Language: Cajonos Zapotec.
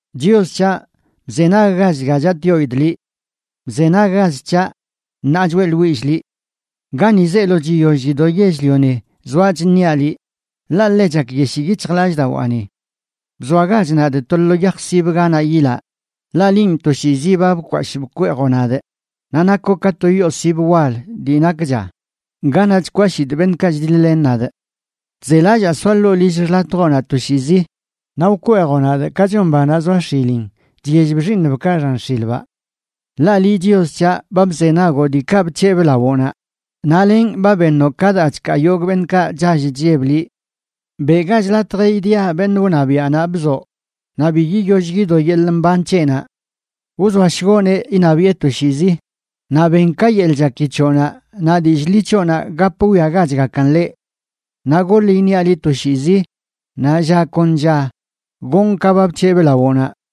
Chios c̱haꞌ, bzenaggach dga chatꞌyoidꞌ liꞌ. Bzenaggach c̱haꞌ ṉaa choeꞌḻwillꞌ liꞌ. Gani zeelo chiyoll chido yell-lioni zoaꞌ chṉiaꞌ liꞌ, ḻaꞌ ḻe chakyeshii yic̱hjlallꞌdawaani. Bzoagach nadꞌ to lo yaj sib ganaꞌ yilaꞌ, ḻaꞌ linꞌ toshiizi ba bkwashꞌ bkweejoꞌ nadꞌ, naꞌ nakoꞌ ka to yoo sib wal dii nakcha ganaꞌ chkwashidꞌ beṉꞌkaꞌ chdiḻ-len nadꞌ. Chzelallaa soaꞌ ḻoo lill xḻatjoꞌnaꞌ toshiizi, naꞌ wkweejoꞌ nadꞌ ka chon banaꞌ zoa x̱ilin chyellb xiiṉbkaꞌ xan x̱ilbaꞌ. Ḻaꞌ liꞌ Chios c̱haꞌ ba bzenagoꞌ diikaꞌ bc̱hebꞌ lawoꞌnaꞌ, naꞌ lenꞌ ba beṉoꞌ ka daa chkaa yogꞌ beṉꞌkaꞌ chall chlleb liꞌ. Beꞌgach latj idia beṉꞌ wṉabiaꞌnaꞌ bzoꞌ, naꞌ bi yiyoll yido yeḻꞌ mban c̱heꞌnaꞌ. Wzoashgoꞌneꞌ iṉabiꞌe toshiizi, naꞌ ben ka yeḻꞌ chaki c̱hoꞌnaꞌ naꞌ dillꞌ ḻi c̱hoꞌnaꞌ gap wwiagachgakan ḻeꞌ. Naꞌ goḻ iṉiaꞌ liꞌ toshiizi, naꞌ lla kon lla gonꞌ ka ba bc̱hebꞌ lawoꞌnaꞌ.